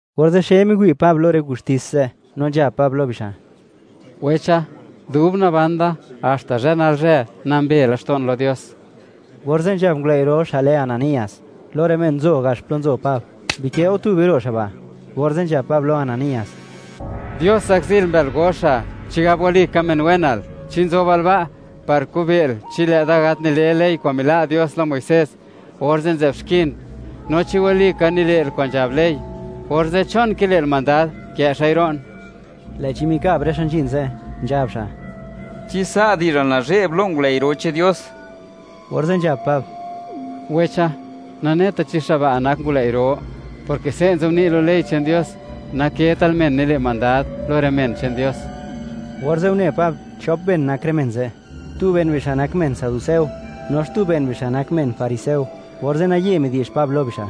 Orze' xe miwi' Pab lo rë gustis ze', no nzhab Pab lo bixa': ―Wecha, dub naban da, haxta zhë nalzhë, nambe laxto'n lo Dios. Orze' nzhab ngulëi' ro', xa' lë Ananías, lo rë men nzo gax plo nzo Pab: —¡Bikë' go tube ro' xa' ba'! Orze' nzhab Pab lo Ananías: ―¡Dios zakzil mbël goxa, chigab walika men wenal! ¿Chi nzobal ba' par kube'l, chi lë'da gat nile ley kwa'n mila' Dios lo Muisés, orze' nzë'b xkin? No chi walika nile'l kwa'n nzhab ley, orze', ¿chon kile'l mandad kë' xa'i ro'n? Lë'chi mikab rë xa' nzhin ze', nzhab xa': ―¿Chi sa' di'zhal nazhe'b lo ngulëi' ro che'n Dios? Orze' nzhab Pab: ―Wecha, naneta chi xa' ba' nak ngulëi' ro; porke se' nzobni' lo ley che'n Dios: “Naketal men nile' mandad lo rë men che'n Dios.” Orze' une Pab, chop ben nak rë men ze'; tu ben bixa' nak men saduceo, no xtu ben bixa' nak men fariseo, orze' naye midi'zh Pab lo bixa':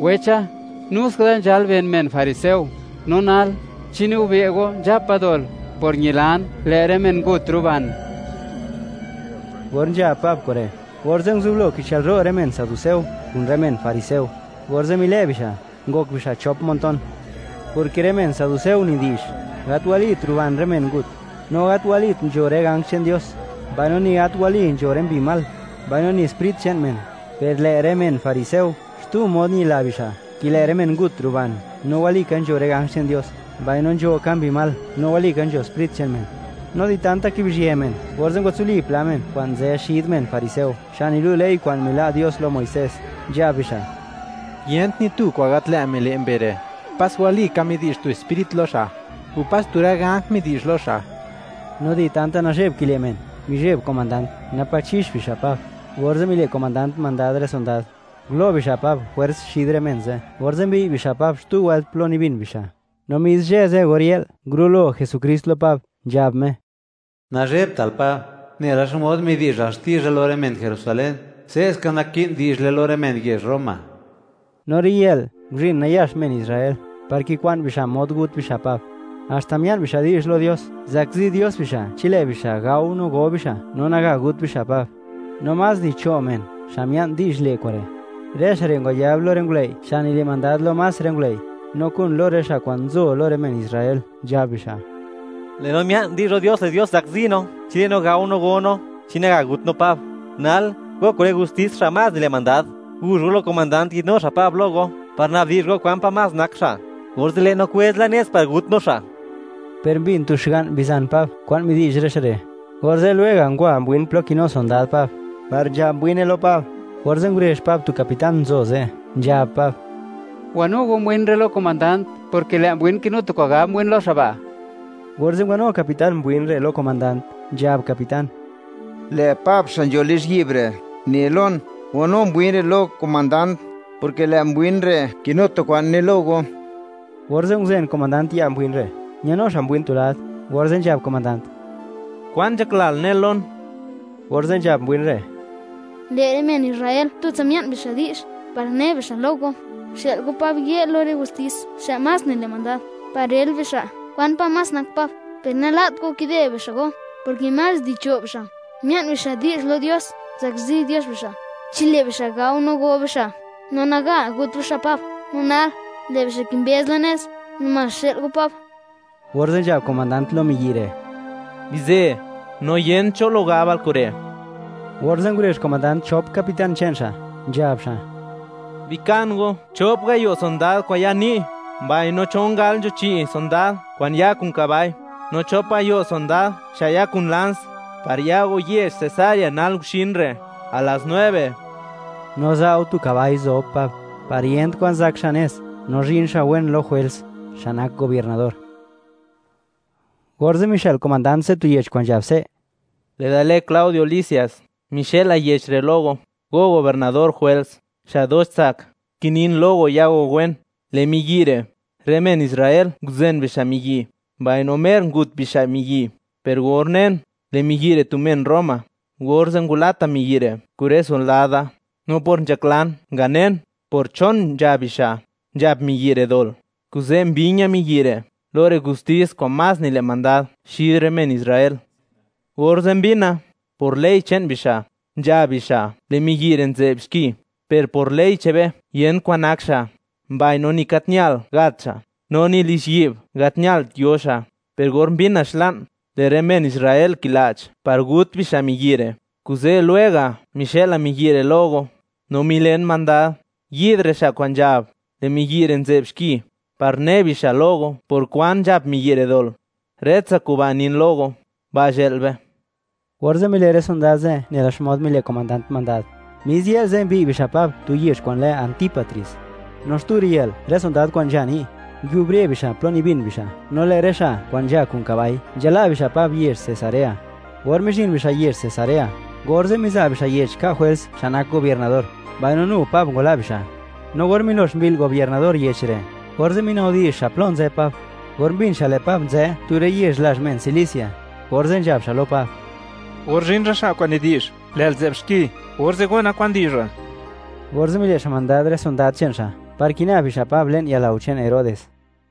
―¡Wecha, nu ska da nzhal ben men fariseo! No nal, ¿chi nigube' go nzhapa dol, por ñilan lë' rë men ngut ruban? Or nzhab Pab kure', orze' nguzublo kichëlro' rë men saduceo kun rë men fariseo, orze' milë' bixa', ngok bixa' chop montón, porke rë men saduceo nidi'zh: “Gat walit ruban rë men ngut, no gat walit nzho rë ganj che'n Dios, mbaino ni gat wali nzho rë mbi mal, mbaino ni sprit che'n men”; per lë' rë men fariseo xtu mod ñila bixa', ke lë' rë men ngut ruban, no walika nzho rë ganj che'n Dios, mbaino nzho ka mbi mal no walika nzho sprit che'n men. No di tanta kibizhië men, orze' ngwatsuli pla men kwa'n nzë xid men fariseo, xa' nilu' ley kwa'n mila' Dios lo Muisés, nzhab bixa': ―¡Yent ni tu kwa'n gat lë' mile' mbe re'; pas wali ka midi'zh tu sprit lo xa', o pas tu rë ganj midi'zh lo xa'! No di tanta nazhe'b kile' men, mizheb komandant, napa' chix bixa' Pab, orze' mile' komandant mandad rë sondad, ngulo' bixa' Pab jwers xid rë men ze', orze' mbiy' bixa' Pab xtu wëlt plo nibin bixa'. No mis zhë ze' or yë'l, ngurulo Jesukrist lo Pab, nzhab Me: ―Nazhebtal Pab; nela xmod midi'zhal xtizha lo rë men Jerusalén, se'ska naki'n di'zhle lo rë men yezh Roma. No riyë'l, nguzhin nayax men Israel, par kikwa'n bixa' mod gut bixa' Pab. Haxta mia'n bixa' di'zh lo Dios, zakzi Dios bixa' chi lë' bixa' gao no go bixa', no naga gut bixa' Pab. No más di cho' men, xa' mia'n di'zh le' kure'. Rë xa' re' ngwayab lo rë ngulëi' xa' nile' mandad lo más rë ngulëi', no kun lo rë xa' kwa'n nzo lo rë men Israel, nzhab bixa': ―Lë' no mia'n di'zh lo Dios, lë' Dios zakzi no chi lë' no gao, no go no, chi naga gut no Pab. Nal, go kun rë gustis xa' más nile' mandad, guzh go lo komandant yi'dnu xa' Pab lo go, par nabdi'zh go kwan pa' más nak xa'. Orze' lë' no kwëz la nez, par gut no xa'. Per mbin tu xga'n bizan Pab kwa'n midi'zh rë xa' re', orze' lwega' ngwa mbwin plo kinu sondad Pab, par nzhab mbwine lo Pab, orze' ngurezh Pab tu capitán nzo ze', nzhab Pab: ―Wanu go mbwin re' lo komandant, porke lë' mbwin kinu tu kwa'n gab mbwin lo xa' ba'. Orze' ngwanu capitán mbwin re' lo komandant, nzhab capitán: ―Lë' Pab xa' nzho lizhyi'b re', ne lon: “Wanu mbwin re' lo komandant”, porke lë' mbwin re' kinu tu kwa'n ne lo go. Orze' nguzen komandant ya' mbwin re', ñanu xa' mbwin tu lad, orze' nzhab komandant: ―¿Kwan nzhaklal nel lon? Orze' nzhab mbwin re': ―Lë' rë men Israel tutsa mia'n bixa' di'zh, par ne bixa' lo go, xë'l go Pab yë' lo rë gustis xa' más nile' mandad, par rël bixa', kwan pa' más nak Pab. Per nala't go, kide bixa' go, porke más di cho' bixa', mia'n bixa' di'zh lo Dios, zakzi Dios bixa' chi lë' bixa' gao no go bixa', no naga gut bixa' Pab. No nal, lë' bixa' kimbëz la nez, namás xë'l go Pab. Orze' nzhab comandant lo mbwin re': ―Bizë, no yent cho lo gabal kure'. Orze' ngurezh komandant chop capitán che'n xa', nzhab xa': ―Bikan go chop gayo' sondad kwa'n ya ni', mbaino chon gal nzho chi' sondad kwa'n ya kun kabai, no chop gayo' sondad xa' ya kun lans, par ya go yezh Cesarea nal guxin re', a las nueve. No za' go tu kabai zob Pab, par yent kwa'n zak xa' nez, no zhin xa' wen lo Jwels, xa' nak gobiernador. Orze' mixë'l komandant ze' tu yech kwa'n nzhab se': “Lë'da lë Claudio Lisias, mixëla yech re' lo go, go gobiernador Jwels, xa' dox tsak. Kinin lo go ya go wen. Lë' miyi' re', rë men Israel nguzen bixa' miyi', mbaino mer ngut bixa' miyi', per or unen, lë' miyi' re' tu men Roma, orze' ngwalata miyi' re' kun rë sondad da. No por nzhaklan nganen, por chon nzhab bixa', nzhap miyi' re' dol, kuze' mbi̱ña̱ miyi' re' lo rë gustis xa' más nile' mandad xid rë men Israel. Orze' mbina, por ley che'n bixa', nzhab bixa' lë' miyi' re' nzë'b xki; per por ley che'n be yent kwa'n nak xa', mbaino ni gat ñal gat xa', no ni lizhyi'b gat ñalt yo xa'. Per or mbina xla'n, lë' rë men Israel kila'ch par gut bixa' miyi' re', kuze' lwega' mixëla miyi' re' lo go. No milen mandad, yi'd rë xa' kwa'n nzhab, lë' miyi' re' nzë'b xki, par ne bixa' lo go por kwan nzhap miyi' re' dol. Rëtsa kuba' nin lo go. Ba' zhë'l be.” Orze' mile' rë sondad ze' nela xmod mile' komandant mandad. Mis yë'l ze', mbiy' bixa' Pab tu yezh kwa'n lë Antípatris. No xtu riyë'l, rë sondad kwa'n nzha ni', nguiubre bixa' plo nibin bixa'; no lë' rë xa' kwa'n nzha kun kabai, nzhala' bixa' Pab yezh Cesarea. Or mizhin bixa' yezh Cesarea, orze' miza' bixa' yech ka' Jwels, xa' nak gobiernador; mbaino nu Pab ngwala' bixa'. No or milox mbi'l gobiernador yech re', orze' minabdi'zh xa' plo nzë Pab. Or mbin xa' lë' Pab nzë tu rë yezh lazh men Cilicia, orze' nzhab xa' lo Pab: ―Or zhin rë xa' kwa'n nidi'zh, lë'l nzë'b xki, orze' gona kwan di'zhal. Orze' mile' xa' mandad rë sondad che'n xa', par kina bixa' Pab le'n yalao che'n Herodes.